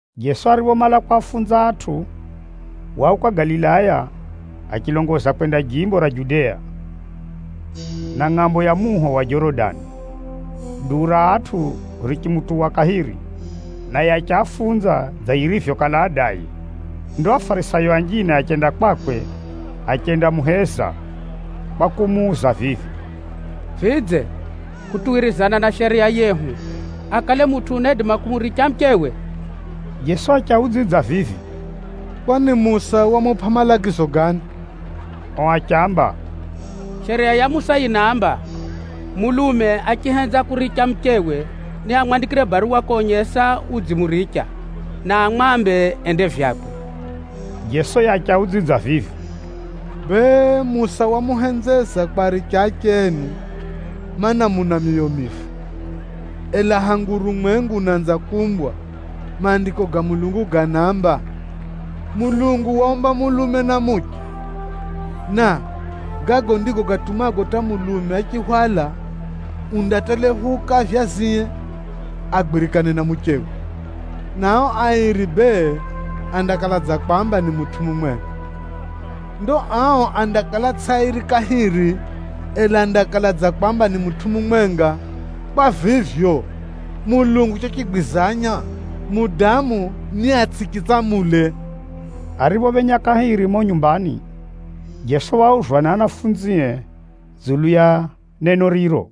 Jeso ariphomala kwafunza atʼu, wauka Galilaya achilongoza kwenda jimbo ra Judea, na ngʼambo ya muho wa Jorodani. Duu ra atʼu richimutuwa kahiri, naye achiafunza dza yirivyokala adaye. Ndo Afarisayo anjine achenda kwakwe achendamuheza kwa kumuuza vivi, “Vidze, kutuwirizana na Shariya yehu, akale mutʼu unaidima kumuricha muchewe?” Jeso achiaudzidza vivi, “Kwani Musa wamupʼa malagizo gani?” Ao achiamba, “Shariya ya Musa yinaamba, mulume achihenza kuricha muchewe, niamwandikire baruwa konyesa kukala udzimuricha jeri, na amwambe ende vyakwe.” Jeso yiye achiaudzidza vivi, “Bee, Musa wamuhenzeza kwaricha ache enu, mana, muna myoyo mifu. Ela hangu urumwengu unaanza kuumbwa, Maandiko ga Mulungu ganaamba, ‘Mulungu waaumba mulume na muche.’ Na ‘Gago ndigo gatumago hata mulume achihwala, undaatelephuka avyazie agwirikane na muchewe, na ao airi andakala mwiri umwenga.’ Ndo ao andakala tsʼio airi kahiri, ela andakala mwiri umwenga. Kwa vivyo, Mulungu chochigwizanya, mudamu niatsʼichitsamule.” Ariphophenya kahiri mumo nyumbani, Jeso wauzwa ni ahumwae dzulu ya neno riro.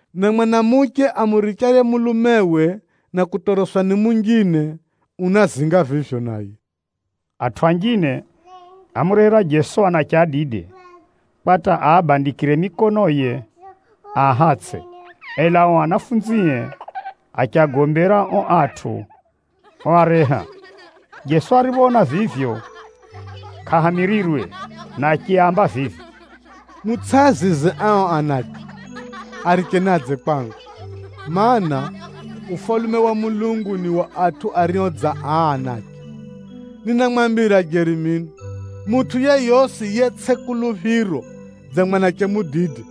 Na mwanamuche amurichaye mulumewe na kutoroswa ni munjine, unazinga vivyo naye.” Atʼu anjine ámurehera Jeso anache adide, kwa hata aabandikire mikonoye aahatsʼe. Ela ao anafunzie achiagombera ao atʼu oareha. Jeso ariphoona vivyo, kʼahamirirwe na achiaamba vivi, “Mutsʼiazize ao anache, aricheni adze kwangu, mana, Ufalume wa Mulungu ni wa atʼu ario dza aa anache. Ninamwambira jeri mino, mutʼu yeyosi yetsʼi kuluphiro dza mwanache mudide,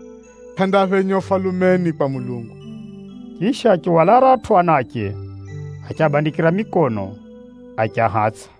kʼandaphenya Ufalumeni kwa Mulungu.” Chisha achihwala aratʼu anache, achiabandikira mikono, achiahatsʼa.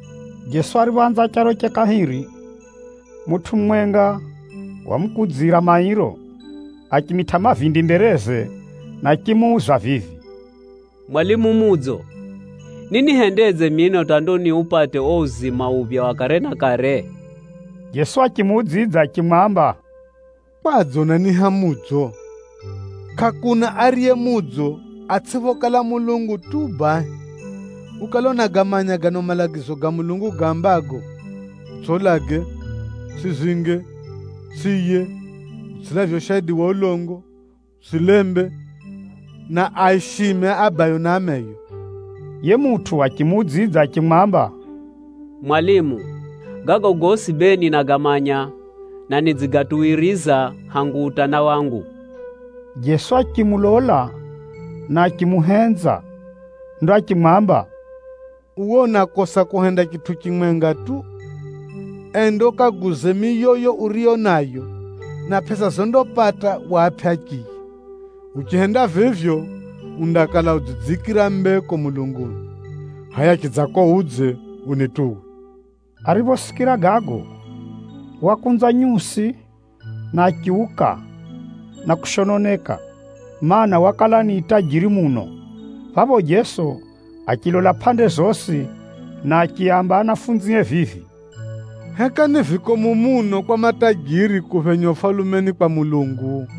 Jeso ariphoanza charoche kahiri, mutʼu mumwenga wamukudzira mairo, achimitʼa mavindi mbereze, na achimuuza vivi, “Mwalimu mudzo, ninihendedze mino hata ndo niupate uo uzima uphya wa kare na kare?” Jeso achimuudzidza achimwamba, “Kwadze unaniiha mudzo? Kʼakuna ariye mudzo, atsʼiphokala Mulungu tu bahi. Ukale unagamanya gano malagizo ga Mulungu gaambago, ‘Utsʼiulage, utsʼizinge, utsʼiiye, utsʼilavye ushaidi wa ulongo, utsʼilembe, na aishime abayo na ameyo’?” Yiye mutʼu achimuudzidza achimwamba, “Mwalimu, gago gosi bee ninagamanya, na nidzigatuwiriza hangu utana wangu.” Jeso achimulola, na achimuhenza. Ndo achimwamba, “Uwe unakosa kuhenda chitʼu chimwenga tu. Enda ukaguze miyoyo uriyo nayo, na pʼesa zondapata uapʼe achiya. Uchihenda vivyo, undakala udzidziikira mbeko mulunguni. Hʼaya chidzako udze, unituwe.” Ariphosikira gago, wakunza nyusi, na achiuka na kushononeka, mana, wakala ni tajiri muno. Phapho Jeso achilola pʼande zosi, na achiaamba anafunzie vivi, “Heka ni vikomu muno kwa matajiri kuphenya Ufalumeni kwa Mulungu!”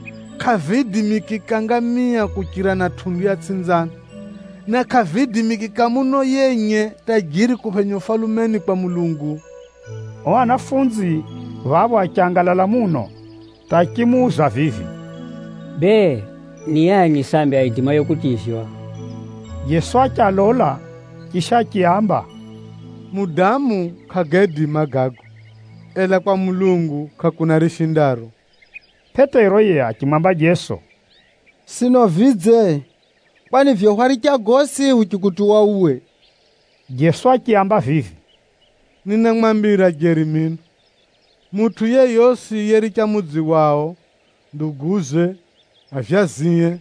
Kʼaviidimikika ngamia kuchira na tʼundu ya tsʼinzano, na kʼaviidimikika muno yenye tajiri kuphenya Ufalumeni kwa Mulungu.” Ao ahumwa a Jeso phapho achangalala muno hata achimuuza vivi, “Bee, ni ani sambi aidimaye kutivywa?” Jeso achialola, chisha achiaamba, “Mudamu kʼagaidima gago, ela kwa Mulungu kʼakuna rishindaro.” Pʼetero yiye achimwamba Jeso, “Sino vidze? Kwani vivyo hwaricha gosi huchikutuwa uwe!” Jeso achiaamba vivi, “Ninamwambira jeri mino, mutʼu yeyosi yericha mudzi wao, nduguze, avyazie,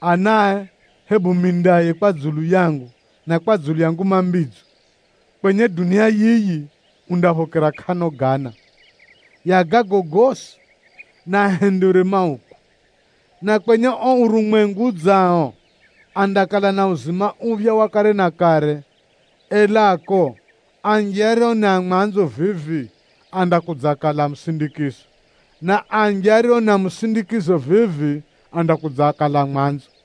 anae hebu mindaye kwa dzulu yangu na kwa dzulu ya Nguma Mbidzo, kwenye dunia yiyi, undaphokera kʼano gana ya gago gosi, na ahenderwe mauku. Na kwenye uo urumwengu udzao, andakala na uzima uphya wa kare na kare. Elako anji ario ni a mwanzo vivi, andakudzakala a musindikizo, na anji ario ni a musindikizo vivi, andakudzakala a mwanzo.”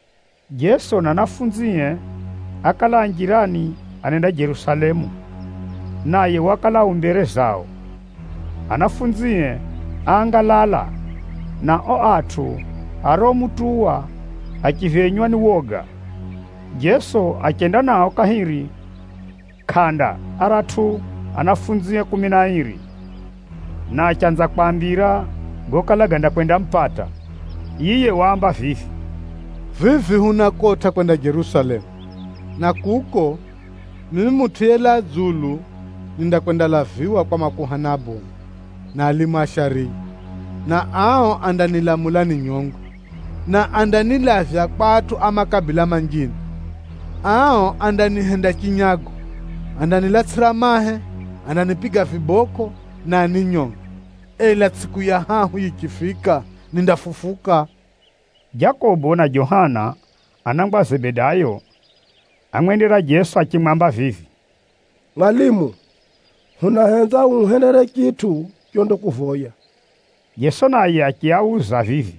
Jeso na ahumwae ákala a njirani anenda Jerusalemu, naye wakala u mbere zao. Ahumwae áangalala, na ao atʼu ariomutuwa achiphenywa ni woga. Jeso achenda nao kahiri kʼanda aratʼu anafunzie kumi na airi, na achanza kwaambira gokala gandakwendamupata. Yiye waamba vivi, “Vivi hunakotʼa kwenda Jerusalemu, na kuko, mimi Mutʼu yelaa dzulu nindakwendalaviwa kwa makuhani abomu, na alimu a shariya, na ao andanilamula ninyongwe, na andanilavya kwa atʼu a makabila manjine. Ao andanihenda chinyago, andanilatsʼira mahe, andanipiga vibokʼo, na aninyonge. Ela tsʼiku ya hahu yichifika, nindafufuka.” Jakobo na Johana, anangwa a Zebedayo, ámwendera Jeso achimwamba vivi, “Mwalimu, hunahenza uhuhendere chitʼu chondakuvoya.” Jeso naye achiauza vivi,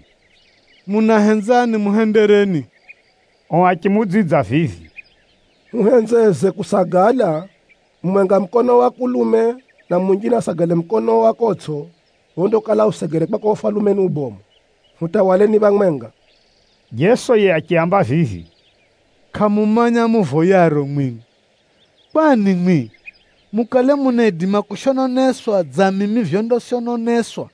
“Munahenza nimuhendereni?” Ao achimuudzidza vivi, “Huhenzeze kusagala, mumwenga mukonoo wa kulume, na munjine asagale mukonoo wa kotsʼo phondakala usegere kwako Ufalumeni ubomu, hutawaleni phamwenga.” Jeso yiye achiaamba vivi, “Kʼamumanya muvoyaro mwimwi. Kwani mwimwi, mukale munaidima kushononeswa dza mimi vyondashononeswa,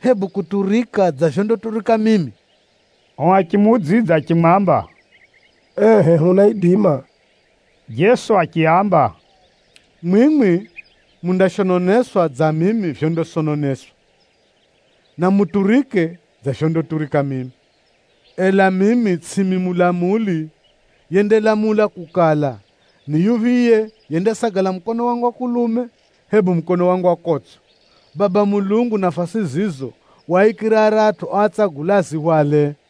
hebu kuturika dza vyondaturika mimi?” Ao achimuudzidza achimwamba, “Ehʼe hunaidima.” Jeso achiaamba, “Mwimwi mundashononeswa dza mimi vyondashononeswa, na muturike dza vyondaturika mimi, ela mimi tsʼimi mulamuli yendalamula kukala, ni yuphiye yendasagala mukono wangu wa kulume, hebu mukono wangu wa kotsʼo. Baba Mulungu nafasi zizo waaikira aratʼu oatsagula azihwale.”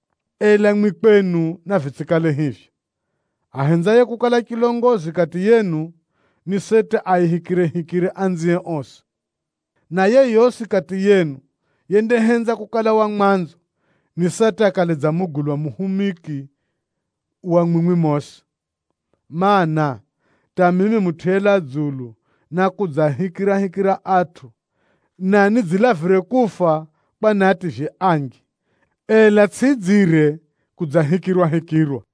Ela mwimwi kwenu navitsʼikale hivyo. Ahenzaye kukala chilongozi kati yenu, ni seti aahikirehikire anzie osi. Na yeyosi kati yenu yendahenza kukala wa mwanzo, ni seti akale dza mugulwa muhumiki wa mwimwi mosi. Maana, hata mimi Mutʼu yelaa dzulu nákudzaahikirahikira atʼu, na nidzilavire kufa kwa niativye anji. Ela tsʼidzire kudzahikirwahikirwa.”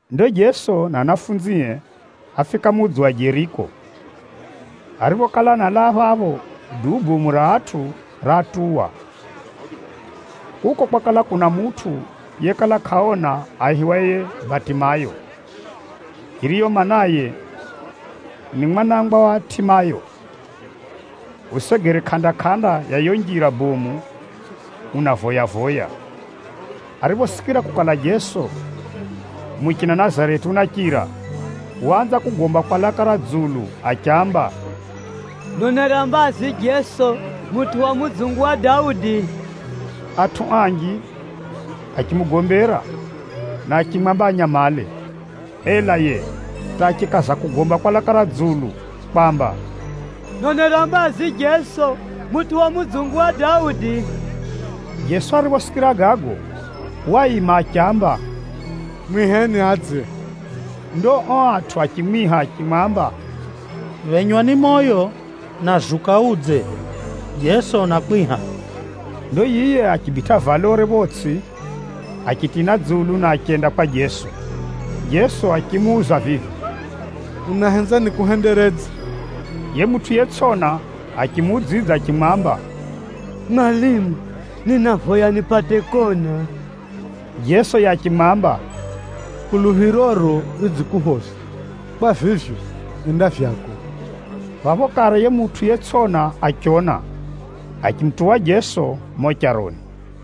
Ndo Jeso na anafunzie áfika mudzi wa Jeriko. Ariphokala analaa phapho, duu bomu ra atʼu raatuwa. Kuko kwakala kuna mutʼu yekala kʼaona aihiwaye Batimayo, yiriyo maanaye ni mwanangwa wa Timayo, usegere kʼanda-kʼanda ya yiyo njira bomu unavoya-voya. Ariphosikira kukala, Jeso muchina Nazareti unachira, waanza kugomba kwa laka ra dzulu achiamba, “Nonera mbazi Jeso mutʼu wa mudzungu wa Daudi!” Atʼu anji achimugombera, na achimwamba anyamale. Ela yiye, hata achikaza kugomba kwa laka ra dzulu kwamba, “Nonera mbazi Jeso mutʼu wa mudzungu wa Daudi!” Jeso ariphosikira gago, waima achiamba, “Mwiheni adze.” Ndo ao atʼu achimwiha achimwamba, “Phenywa ni moyo! Na zuka udze, Jeso unakwiha!” Ndo yiye achibitʼa valore photsʼi, achitina dzulu na achenda kwa Jeso. Jeso achimuuza vivi, “Unahenza nikuhenderedze?” Yiye mutʼu yetsʼona achimuudzidza achimwamba, “Mwalimu, ninavoya nipate kona.” Jeso yiye achimwamba, “Kuluphiroro ridzikuphoza. Kwa vivyo, enda vyako.” Phapho kare yiye mutʼu yetsʼona achiona, achimutuwa Jeso mumo charoni.